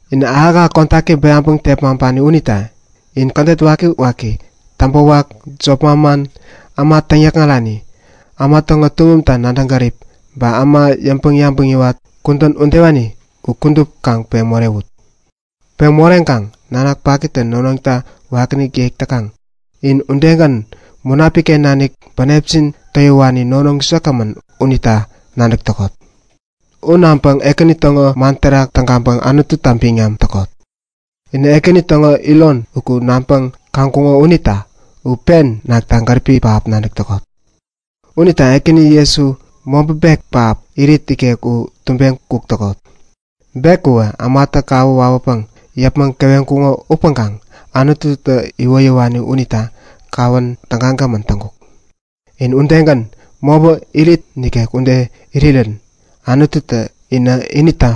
Inä ahäk-ahäk kodaki bäyaŋpäŋ tepmaŋpani unita in kädet wakiwaki, täŋpäwak, jop manman, äma täŋyäkŋarani, äma täŋo tuŋumta nadäŋ gärip, ba äma yäŋpäŋ-yabäŋ yäwat, kudän udewani u kudup kaŋ peŋ morewut. Peŋ moreŋkaŋ nanak pakitä nonoŋta wakiinik yek täkaŋ, in udegän Munapik-ken nanik bänepjin towiwani nonoŋ säkgämän unita nadäk täkot. U naŋpäŋ Ekäni täŋo man terak tägaŋpäŋ Anututa biŋam täkot. Inä Ekäni täŋo iron uku naŋpäŋ-nadäŋkuŋo unita u pen nakta gäripi pähap nadäk täkot. Unita Ekäni Jesu, mobä bek pähap irit ikek u tubeŋ kuk täkot. Bek uwä ämatä kawä wawäpäŋ yäpmäŋ keweŋkuŋo upäŋkaŋ Anututä iwoyäwani unita kawän tägagämän täŋkuk. In udegän, mobä irit ikek ude irirä Anututä inä inita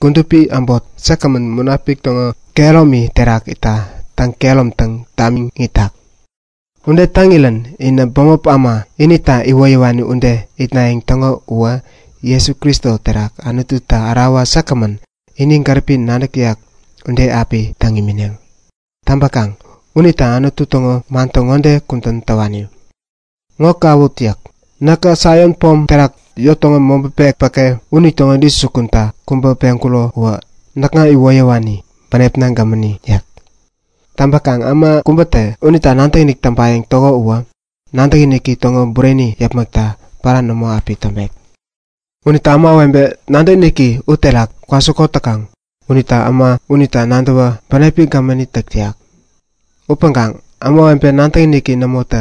kudupi äbot säkgämän Munapik täŋo kehäromi terak itta täŋ-kehäromtaŋ tamiŋ itak. Ude täŋirän inä bämop äma, inita iwoyäwani ude itnayäŋ täŋo uwä Jesu Kristo terak Anututa ärawa säkgämän, ini gäripi nadäk täyak ude api täŋ imineŋ. Täŋpäkaŋ unita Anutu täŋo man ŋode kudän täwani; Ŋo kawut yäk. Näkä Saion pom terak yot täŋo mobä bek päke unitäŋo intäjukunta kubä peŋkuro uwä näkŋa iwoyäwani, bänepna gämäni yäk. Täŋpäkaŋ äma kubätä unita nadäkinik täŋpayäŋ täko uwä nadäkiniki täŋo bureni yäpmäkta pära nämo api täŋpek. Unita ämawebe nadäkiniki uterak kwasikot täkaŋ unitä äma unita nadäwä bänepi gämäni täk täyak. Upäŋkaŋ ämawebe nadäkiniki nämota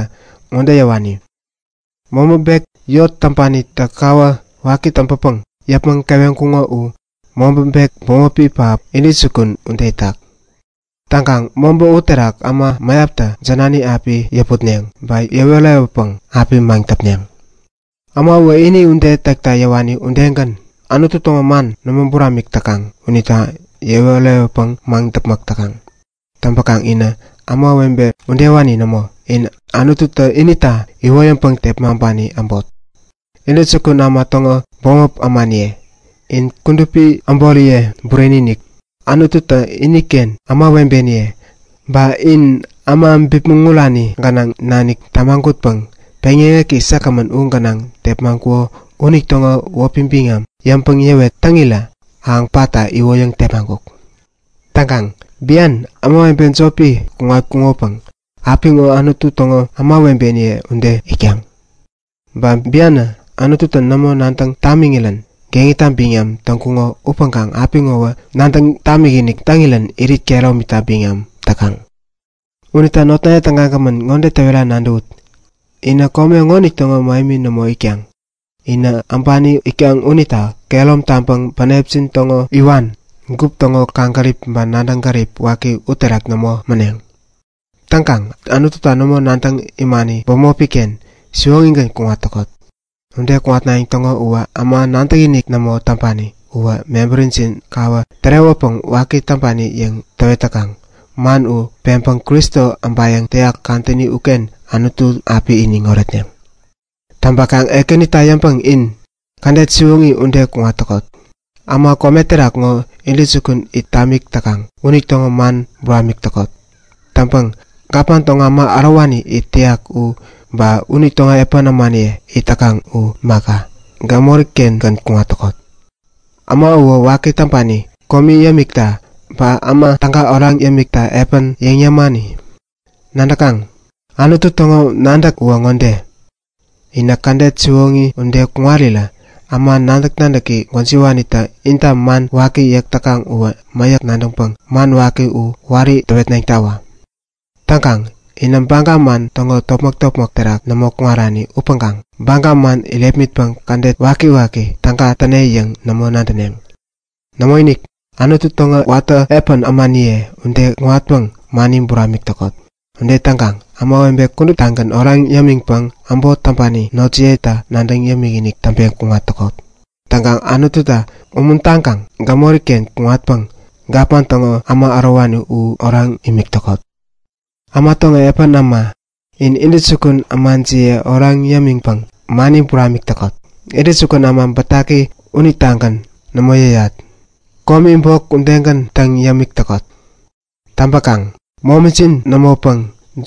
ŋode yäwani; Mobä bek, yot täŋpanitä kawä waki täŋpäpäŋ yäpmäŋ keweŋkuŋo u mobä bek bämopi pähap, intäjukun ude itak. Täŋkaŋ mobä uterak äma mäyaptä jänani api yäputneŋ ba yewä äreyäwäpäŋ api maŋdäpneŋ. Äma uwä ini ude täkta yäwani udegän Anutu täŋo man nämo buramik täkaŋ unita yewä äreyäwäpäŋ maŋdäpmäk täkaŋ. Täŋpäkaŋ inä ämawebe udewani nämo. In Anututä inita iwoyäŋpäŋ tepmaŋpani äbot, Intäjukun Äma täŋo bämop ämaniye. In kudupi äboriye bureni-inik, Anututä iniken ämawebeniye. Ba in äma bipmäŋ urani gänaŋ nanik tämagutpäŋ peŋyäŋeki säkgämän u gänaŋ tepmaŋkuko unitäŋo wäpi biŋam yäŋpäŋ yäwet täŋirä ahäŋ patta iwoyäŋ tepmaŋkuk. Täŋkaŋ bian, ämawebe jopi kuŋatkuŋopäŋ apiŋo Anutu täŋo kudupi ämawebeniye ude itkaŋ. Ba bianä Anututä nämo nadäŋ tamiŋirän geŋita biŋam täŋkuŋo upäŋkaŋ apiŋowä nadäŋ tamikinik täŋirän irit kehäromita biŋam täkaŋ. Unita notnaye tägagämän, ŋode täwera nadäwut; Inä kome ŋonitäŋo mähemi nämo itkaŋ, inä äbani itkaŋ unita kehärom taŋpäŋ bänepjin täŋo iwan, gup täŋo kaŋgärip ba nadäŋ gärip waki uterak nämo mäneŋ. Täŋkaŋ Anututa nämo nadäŋ imani bämopi-ken siwoŋigän kuŋat täkot. Ude kuŋatnayäŋ täŋo uwä äma nadäkinik nämo täŋpani uwä mebärijin kawä tärewäpäŋ waki täŋpani yäŋ täwet täkaŋ, man u peŋpäŋ Kristo äbayäŋ täyak kadäni uken Anutu api iniŋ oretneŋ. Täŋpäkaŋ Ekänita yäŋpäŋ in kädet siwoŋi ŋode kuŋat täkot; Äma kome terak ŋo intäjukun it tamik täkaŋ unitäŋo man buramik täkot. Täŋpäŋ gapman täŋo äma ärowani it täyak u ba unitäŋo epän ämaniye it täkaŋ u imaka, gämori-kengän kuŋat täkot. Äma uwä waki täŋpani komi yämikta ba äma täga oraŋ yämikta epän yäŋ yämani. Nadäkaŋ? Anutu täŋo nadäk uwä ŋode; Inä kädet siwoŋi ude kuŋarirä äma nadäk-nadäki gwäjiwanitä inta man waki yäk täkaŋ uwä mäyäk nadäŋpäŋ man waki u wari täwetneŋtawä. Täŋkaŋ inä baga man täŋo topmäk-topmäk terak nämo kuŋarani upäŋkaŋ baga man irepmitpäŋ kädet wakiwaki täga täne yäŋ nämo nadäneŋ. Nämoinik, Anutu täŋo watä epän ämaniye ude kuŋatpäŋ mani buramik täkot. Ude täŋkaŋ ämawebe kuduptagän oraŋ yämiŋpäŋ äbot täŋpani notjiyeta nadäŋ yämikinik täŋpeŋ kuŋat täkot. Täŋkaŋ Anututa umuntaŋpäŋ u gämori-ken kuŋatpäŋ kome täŋo intäjukun äma u oraŋ imik täkot. Äma täŋo epän äma, in intäjukun ämajiye oraŋ yämiŋpäŋ mani buramik täkot. Kome täŋo intäjukun äma bätaki unitagän nämo yäyat. Nämo, komita bok yäyat. Täŋpäkaŋ momijin nämopäŋ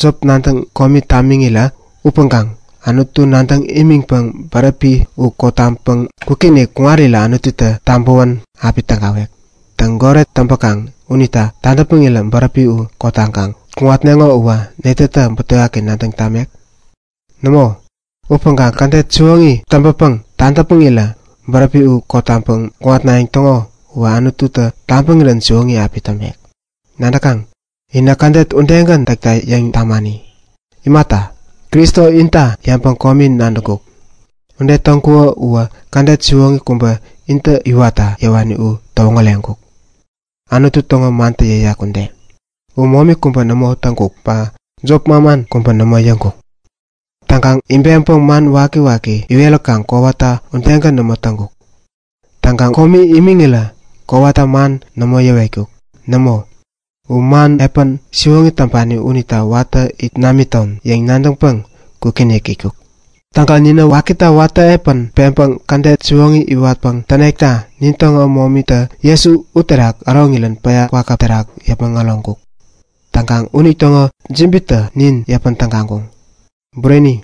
jop nadäŋ komi tamiŋirä upäŋkaŋ Anutu nadäŋ imiŋpäŋ bäräpi u kotaŋpäŋ kwikinik kuŋarirä Anututä tabäwän api tägawek. Täŋ, goret täŋpäkaŋ unita tadäpmäŋirä bäräpi u kotaŋkaŋ kuŋatneŋo uwä netätä butewaki nadäŋ tamek? Nämoinik, upäŋkaŋ kädet siwoŋi täŋpäpäŋ tadäpmäŋirä bäräpi u kotaŋpäŋ kuŋatnayäŋ täŋo uwä Anututä tabäŋirän siwoŋi api täŋpek. Nadäkaŋ? Inä kädet udegän täkta yäŋ tamani. Imata, Kristo inta yäŋpäŋ komi nadäŋkuk. Ude täŋkuko uwä kädet siwoŋi kubä intä iwatta yäwani u täwoŋäreŋkuk, Anutu täŋo mantä yäyak ude; U momi kubä nämo täŋkuk ba jop manman kubä nämo yäŋkuk. Täŋkaŋ ibeŋpäŋ man wakiwaki iweräkaŋ kowata udegän nämo täŋkuk. Täŋkaŋ komi imiŋirä kowata man nämo yäwetkuk. Nämo, u man epän siwoŋi täŋpani unitä watä it namiton yäŋ nadäŋpäŋ kwikinik itkuk. Täŋkaŋ ninä wakita watä epän peŋpäŋ kädet siwoŋi iwatpäŋ tänekta nintäŋo momitä Jesu uterak äroŋirän päya kwakäp terak yäpmäŋ äroŋkuk. Täŋkaŋ unitäŋo jibitä nin yäpän tägaŋkuŋ. Bureni,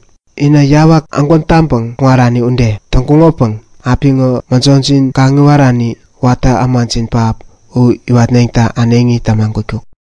inä yawak ägwän taŋpäŋ kuŋarani ude täŋkuŋopäŋ apiŋo mäjojin kaŋiwarani, watä ämajin pähap u iwatneŋta äneŋi tämagutkuk.